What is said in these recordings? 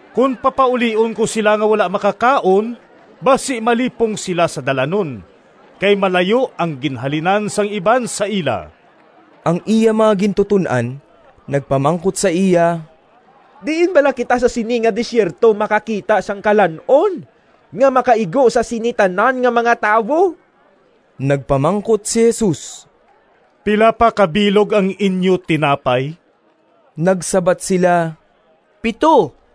Kon papaulion ko sila nga wala makakaon basi malipong sila sa dalanon kay malayo ang ginhalinan sang iban sa ila.” Ang iya mga gintuton-an nagpamangkot sa iya, “Diin bala kita sa sini nga desierto makakita sang kalan-on nga makaigo sa sini tanan nga mga tawo?” Nagpamangkot si Jesus, “Pila pa ka bilog ang inyo tinapay?” Nagsabat sila, “Pito.”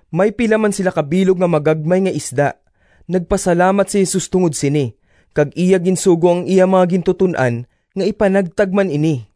May pila man sila ka bilog nga magagmay nga isda. Nagpasalamat si Jesus tungod sini kag iya ginsugo ang iya mga gintuton-an nga ipanagtag man ini.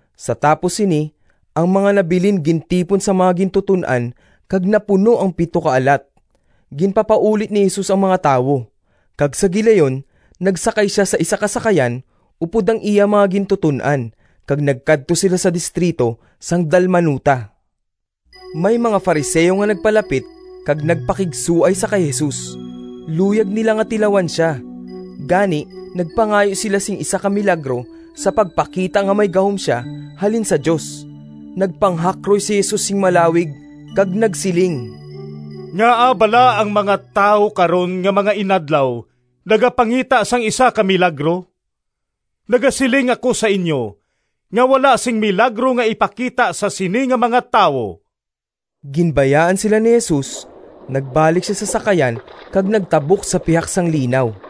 Sa tapos sini ang mga nabilin gintipon sang mga gintuton-an kag napuno ang pito ka alat. Ginpapauli ni Jesus ang mga tawo, kag sa gilayon nagsakay sia sa isa ka sakayan upod ang iya mga gintuton-an kag nagkadto sila sa distrito sang Dalmanuta. May mga Fariseo nga nagpalapit kag nagpakigsuay sa kay Jesus. Luyag nila nga tilawan sia, gani nagpangayo sila sing isa ka milagro sa pagpakita nga may gahom sia halin sa Dios. Nagpanghakroy si Jesus sing malawig kag nagsiling, “Ngaa bala nga ang mga tawo karon nga mga inadlaw nagapangita sang isa ka milagro? Nagasiling ako sa inyo, nga wala sing milagro nga ipakita sa sini nga mga tawo!” Ginbayaan sila ni Jesus, nagbalik sia sa sakayan kag nagtabok sa pihak sang linaw.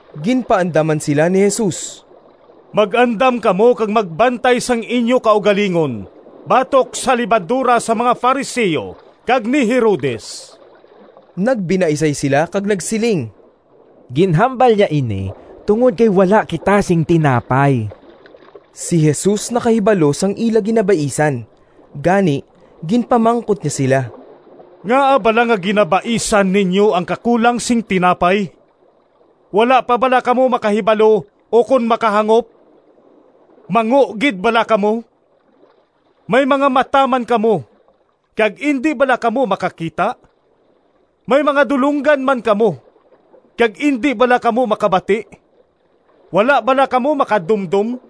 Ginpaandaman sila ni Jesus, “Mag-andam kamo kag magbantay sang inyo kaugalingon batok sa lebadora sang mga Fariseo kag ni Herodes.” Nagbinaisay sila kag nagsiling, “Ginhambal niya ini tungod kay wala kita sing tinapay.” Si Jesus nakahibalo sang ila ginabaisan, gani ginpamangkot niya sila, “Ngaa bala nga ginabaisan ninyo ang kakulang sing tinapay? Wala pa bala kamo makahibalo ukon makahangop? Mango gid bala kamo? May mga mata man kamo, kag indi bala kamo makakita? May mga dulonggan man kamo, kag indi bala kamo makabati? Wala bala kamo makadumdom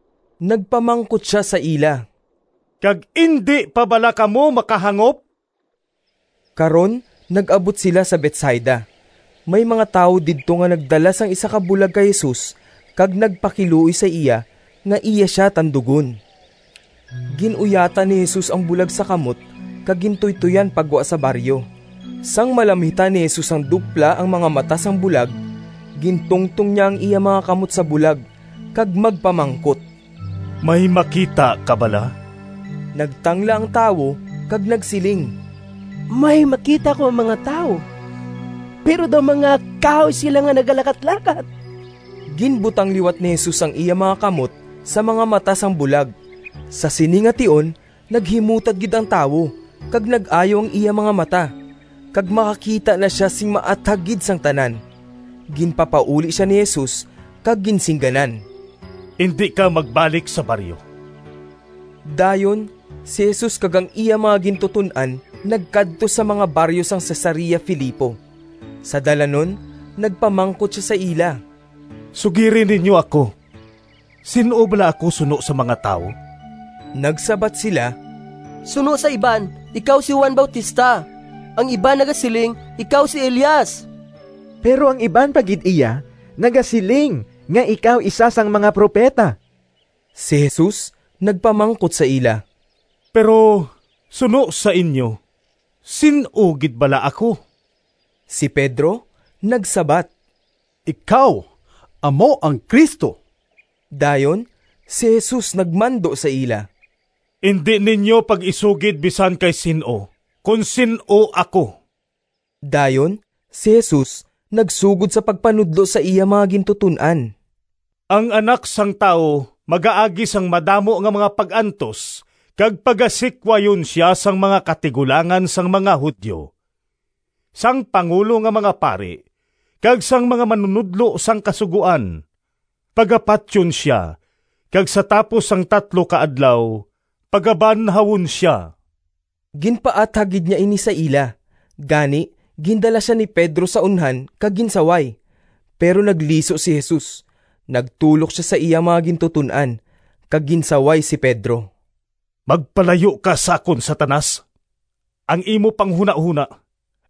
Nagpamangkot sia sa ila, “Kag indi pa bala kamo makahangop?” Karon nag-abot sila sa Betsaida. May mga tawo didto nga nagdala sang isa ka bulag kay Jesus kag nagpakiluoy sa iya nga iya sia tandugon. Gin-uyatan ni Jesus ang bulag sa kamot kag gintuytoyan pa gwa sa baryo. Sang malamhitan ni Jesus sang dupla ang mga mata sang bulag, gintungtong niya ang iya mga kamot sa bulag kag magpamangkot, “May makita ka bala?” Nagtangla ang tawo kag nagsiling, “May makita ako nga mga tawo, pero daw mga kahoy sila nga nagalakatlakat.” Ginbutang liwat ni Jesus ang iya mga kamot sa mga mata sang bulag. Sa sini nga tion naghimutad gid ang tawo kag nag-ayo ang iya mga mata, kag makakita na sia sing maathag gid sang tanan. Ginpapauli sia ni Jesus kag ginsingganan, “Indi ka magbalik sa baryo.” Dayon si Jesus kag ang iya mga gintuton-an nagkadto sa mga baryo sang Cesarea Filipo. Sa dalanon nagpamangkot sia sa ila, “Sugiri ninyo ako, sin-o bala ako suno sa mga tawo?” Nagsabat sila, “Suno sa iban ikaw si Juan Bautista, ang iban nagasiling ikaw si Elias, pero ang iban pa gid iya nagasiling nga ikaw isa sang mga propeta.” Si Jesus nagpamangkot sa ila, “Pero suno sa inyo, sin-o gid bala ako?” Si Pedro nagsabat, “Ikaw amo ang Cristo.” Dayon si Jesus nagmando sa ila, “Indi ninyo pag-isugid bisan kay sin-o, kon sin-o ako.” Dayon si Jesus nagsugod sa pagpanudlo sa iya mga gintuton-an, “Ang Anak sang Tawo magaagi sang madamo nga mga pag-antos, kag pagasikwayon sia sang mga katigulangan sang mga Judio, sang pangulo nga mga pari, kag sang mga manunodlo sang Kasugoan. Pagapatyon sia kag sa tapos sang tatlo ka adlaw pagabanhawon sia.” Ginpaathag gid niya ini sa ila. Gani gindala sia ni Pedro sa unhan kag ginsaway. Pero nagliso si Jesus, nagtulok sa iya mga gintuton-an, kag ginsaway si Pedro, “Magpalayo ka sa akon, Satanas, ang imo panghunahona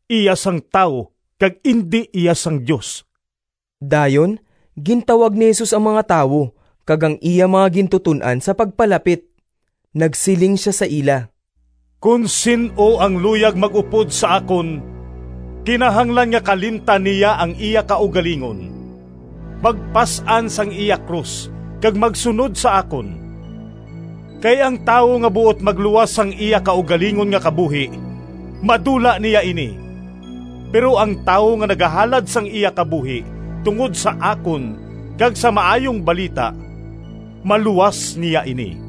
iya sang tawo kag indi iya sang Dios!” Dayon gintawag ni Jesus ang mga tawo kag ang iya mga gintuton-an sa pagpalapit. Nagsiling sia sa ila, “Kon sin-o ang luyag mag-upod sa akon, kinahanglan nga kalimtan niya ang iya kaugalingon, magpas-an sang iya krus kag magsunod sa akon. Kay ang tawo nga buot magluwas sang iya kaugalingon nga kabuhi madula niya ini, pero ang tawo nga nagahalad sang iya kabuhi tungod sa akon kag sa Maayong Balita maluwas niya ini.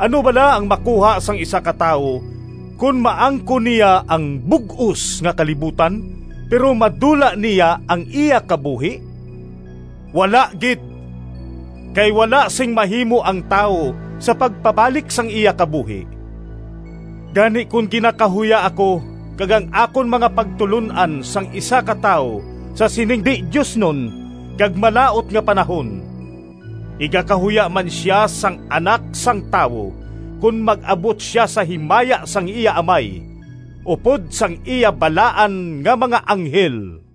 Ano bala ang makuha sang isa ka tawo kon maangkon niya ang bug-os nga kalibutan, pero madula niya ang iya kabuhi? Wala gid! Kay wala sing mahimo ang tawo sa pagpabalik sang iya kabuhi. Gani kon ginakahuya ako kag ang akon mga pagtulon-an sang isa ka tawo sa sining di-diosnon kag malaut nga panahon, igakahuya man sia sang Anak sang Tawo kon mag-abot sia sa himaya sang iya Amay upod sang iya balaan nga mga anghel.”